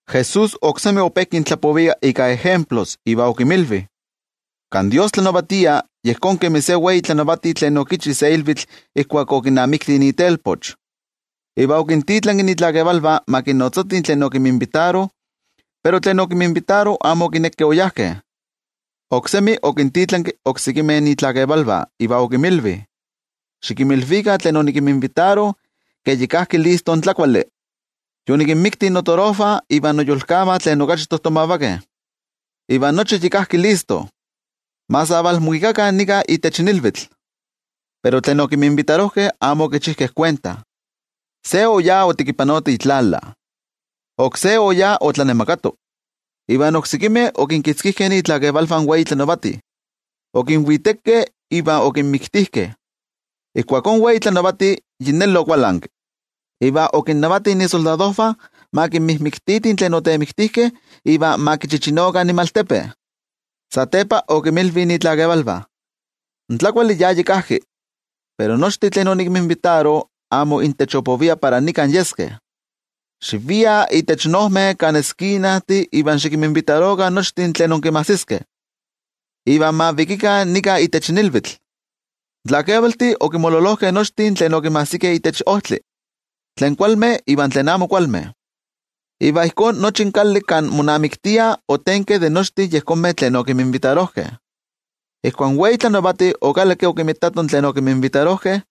Jesús oksemi ope kintlapovia ika ejemplos iva okinmilvi: —Kan Dios tlanavatia, yejón kemi se wei tlanavati tlen okichi se ilvitl ijkuak okinamikti itelpoch. Iva okintitlanki itlakevalvah ma kinnotzatih tlen okinminvitaro, pero tlen okinminvitaro amo okinekeh oyajkeh. Oksemi okintitlanki oksekimeh itlakevalvah iva okinmilvi: “Xikinmilvikah tlen onikinminvitaro ke yi kajki listo in tlakuali. Yonikinmikti notorojvah iva noyolkavah tlen okachi tojtomavakeh, iva nochi yi kajki listo, ma sa valmuikakah nika itech ilvitl.” Pero tlen okinminvitarojkeh amo okichijkeh kuenta. Se oyá otekipanoto itlala, oksé oyá otlanemakato, iva oksekimeh okinkitzkijkeh itlakevalvah in wei tlanavati, okinvitekeh iva okinmiktijkeh. Ijkuakó in wei tlanavati yi neli okualanki, iva okinnavati isoldadojvah ma kinmijmiktikah tlen otemiktijkeh iva ma kichichinokah inmaltepe. Satepa okinmilvi itlakevalvah: “In tlakuali ya yi kajki, pero nochtin tlen onikinminvitaro amo intech opovia para nikan yeskeh. Xiviah itech ojmeh kan eskinajtih iva xikinminvitarokah nochtin tlen inkinmajsiskeh, iva ma vikikah nika itech ilvitl.” In tlakevaltih okinmololojkeh nochtin tlen okinmajsikeh itech ojtli, tlen kualmeh iva tlen amo kualmeh. Iva ijkó nochi in kali kan monamiktiah otenki de nochtin tlen okinminvitarojkeh. ’Ijkuak in wei tlanavati okalakki okinmitato tlen okinminvitarojkeh,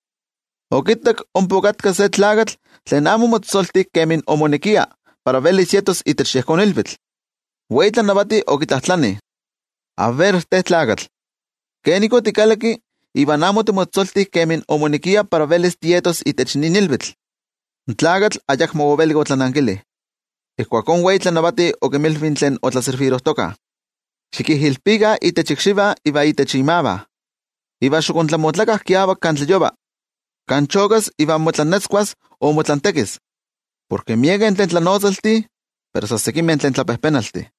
okittak ompa okatka se tlakatl tlen amo omotzotzolti kemi omonekia para velis yetos itech yejón ilvitl. In wei tlanavati okitlajtlani: “A ver te tlakatl, ¿kenik otikalakki iva amo otimotzotzolti kemi moneki para velis tietos itech nin ilvitl?” In tlakatl ayakmo ovelik otlanankili. Ijkuakó in wei tlanavati okinmilvi tlen otlaservirojtokah: “Xikijilpikah itech ikxivah iva itech imavah, iva xiktlamotlakah kiavak kan tlayova, kan chokas iva motlantekis.” Porke miekeh tlen tlanotzaltih pero san sekimeh tlen tlapejpenaltih.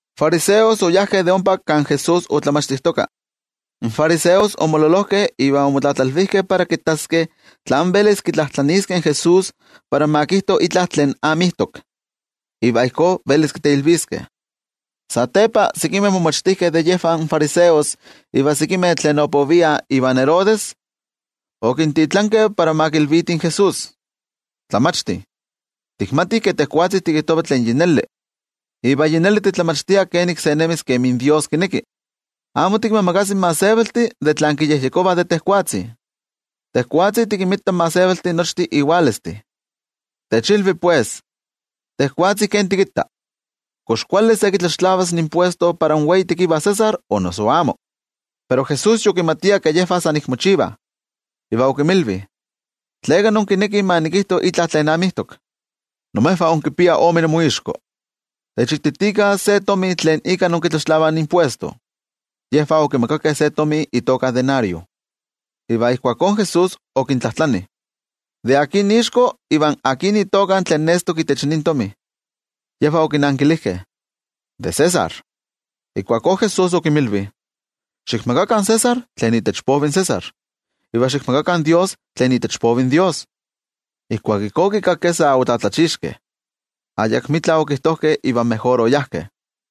In fariseos okiskeh de ompa de kan Jesús otlamachtijtoka. In fariseos omololojkeh iva omotlatlalvijkeh para kittaskeh tlán velis kitlajtlaniiskeh in Jesús para ma kijto itla tlen amijtok, iva ijkó velis kiteilviskeh. Satepa, sekimeh momachtijkeh de yejvah in fariseos iva sekimeh tlen opoviah ivan Herodes, okintitlankeh para ma kilvitih in Jesús: —Tlamachti, tikmatih ke tejwatzi tikijtova tlen yi neli, iva yi neli titlamachtia kenik se nemis kemi Dios kineki. Amo tikinmiimakasi in gentejtih de tlan kiyejyekovah de tejwatzi. Tejwatzi tikinmita in gentejtih nochtin iwalestih. Techilvi, pues, tejwatzi ken tikitta: ¿Kox kuali se kitlaxtlavas impuestos para in wei tekiva César, o noso amo? Pero Jesús yokimatia ke yejvah san ik mochivah, iva okinmilvi: —¿Tleka inkinekih ma nikijto itla tlen amijtok? ¡Imejvah inkipiah ome inmoixko! Techititikah se tomi tlen ika inkitlaxtlavah impuesto. Yejvah okimakakeh se tomi itoka denario. Iva ijkuakó Jesús okintlajtlani: —¿De akin ixko iva akin itoka tlen nestok itech nin tomi? Yejvah okinankilijkeh: —De César. Ijkuakó Jesús okinmilvi: —Xikmakakah in César tlen itech povi in César, iva xikmakakah in Dios tlen itech povi in Dios. Ijkuak ijkó okikakkeh, omotetzavijkeh. Ayakmitla okijtojkeh iva mejor oyajkeh.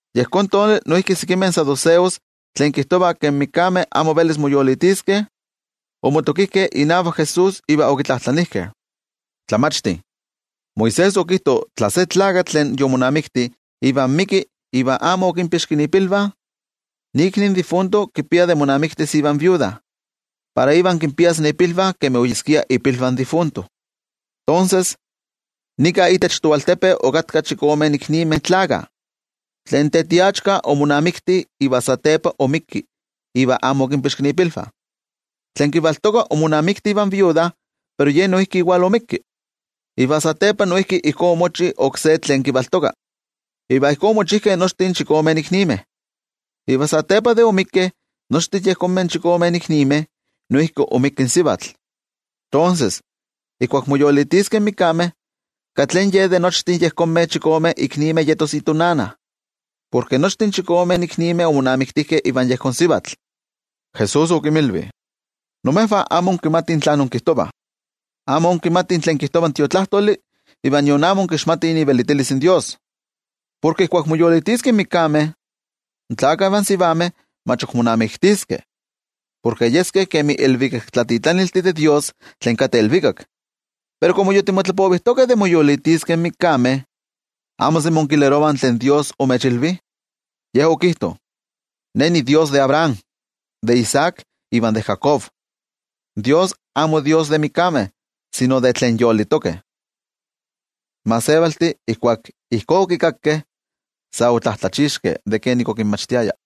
Yejón tonali noijki sekimeh saduceos tlen kijtovah ke in mikameh amo velis moyolitiskeh, omotokijkeh inavak Jesús iva okitlajtlanijkeh: —Tlamachti, Moisés okijto tla se tlakatl tlen yomonamikti iva ixpolivi iva amo okinpixki ipilvah, ikni in difunto kipia de monamiktis ivan iknosivatl para ivan kinpias ipilvah kemi oyeskia ipilvah in difunto. Tonses, nika itech toaltepe okatkah chikome iknimeh tlakah. Tlen tetiachka omonamikti, iva satepa oixpolivik iva amo okinpixki ipilvah. Tlen kivaltoka omonamikti ivan iknosivatl. Pero ye noijki oixpolivik. Iva satepa noijki ijkó omochi oksé tlen kivaltoka, iva ijkó omochijkeh nochtin chikome iknimeh. Iva satepa de oixpolikeh nochtin yejonmeh chikome iknimeh, noijki oixpolivik in sivatl. Tonses, ijkuak moyolitiskeh in mikameh, ¿katli ye de nochtin yejonmeh chikome iknimeh yetos itonana? Porke nochtin chikome iknimeh omonamiktijkeh ivan yejón sivatl. Jesús okinmilvi: —Imejvah amo inkimatih tlen inkijtovah. Amo inkimatih tlen kijtova in Tiotlajkuiloli iva nion amo inkixmatih ivelitilis in Dios. Porke ijkuak moyolitiskeh in mikameh, in tlakah ivan sivameh mach ok monamiktiskeh, porke yeskeh kemi ilvikaktlatitlaniltih de Dios tlen kateh ilvikak. Pero komo yi timotlapovijtokeh de moyolitiskeh in mikameh, ¿amo semi inkilerovah tlen Dios omechilvi? Ye okijto: “Ne niDios de Abraham, de Isaac iva de Jacob.” In Dios amo Dios de mikameh sino de tlen yolitokeh. In gentejtih ijkuak ijkó okikakkeh, sa otlatlachixkeh de kenik okinmachtiaya.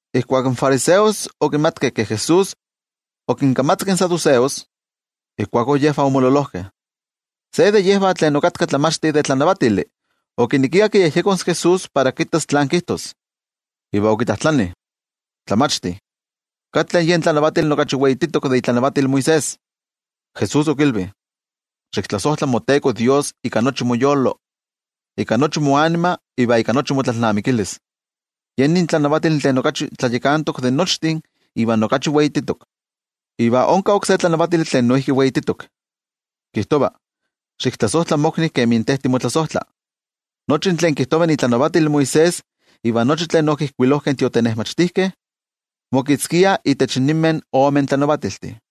Ijkuak in fariseos okimatkeh ke Jesús okinkamatzaki in saduceos, ijkuakó yejvah omololojkeh. Se de yejvah tlen okatka tlamachti de tlanavatili okinekia kiyejyekos in Jesús para kittas tlan kijtos. Iva okitlajtlani: —Tlamachti, ¿katli yen tlanavatili okachi weititok de itlanavatil Moisés? Jesús okilvi: —“Xiktlasojtla moTeko Dios ika nochi moyolo, ika nochi moanima iva ika nochi motlalnamikilis.” Ye nin tlanavatili tlen okachi tlayakantok de nochtin iva okachi weititok. Iva onka oksé tlanavatili tlen noijki weititok, kijtova: “Xiktlasojtla mokni kemi te timotlasojtla.” Nochi tlen kijtova itlanavatil Moisés iva nochi tlen okijkuilojkeh in tiotenejmachtijkeh, mokitzkiah itech ninmeh ome tlanavatiltih.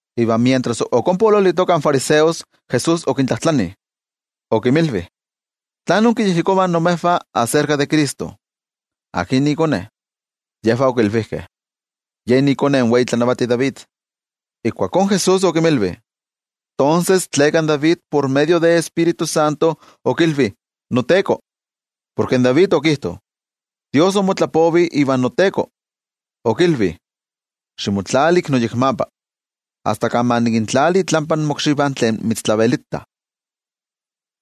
Iva mientras ok ompa oololitokah in fariseos, Jesús okintlajtlani, okinmilvi: —¿Tlán inkiyejyekovah imejvah aserka de Cristo? ¿Akin ikone? Yejvah okilvijkeh: —Yen ikone in wei tlanavati David. Ijkuakó Jesús okinmilvi: —Tonses, ¿tleka in David por medio de Tioijyotzintli okilvi “noTeko”? Porke David okijto: Dios omotlapovi ivan noTeko, okilvi: “Ximotlali ik noyekmapa, asta kan ma nikintlali itlampa mokxivah tlen mitztlavelitah.”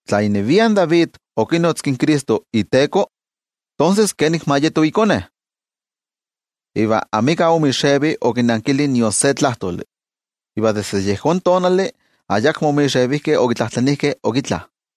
Tla inevia in David okinotzki in Cristo iTeko, ¿tonses kenik ma yeto ikone? Iva amika omixevi okinankili nion se tlajtoli. Iva desde yejón tonali ayakmo omixevijkeh okitlajtlanijkeh ok itla.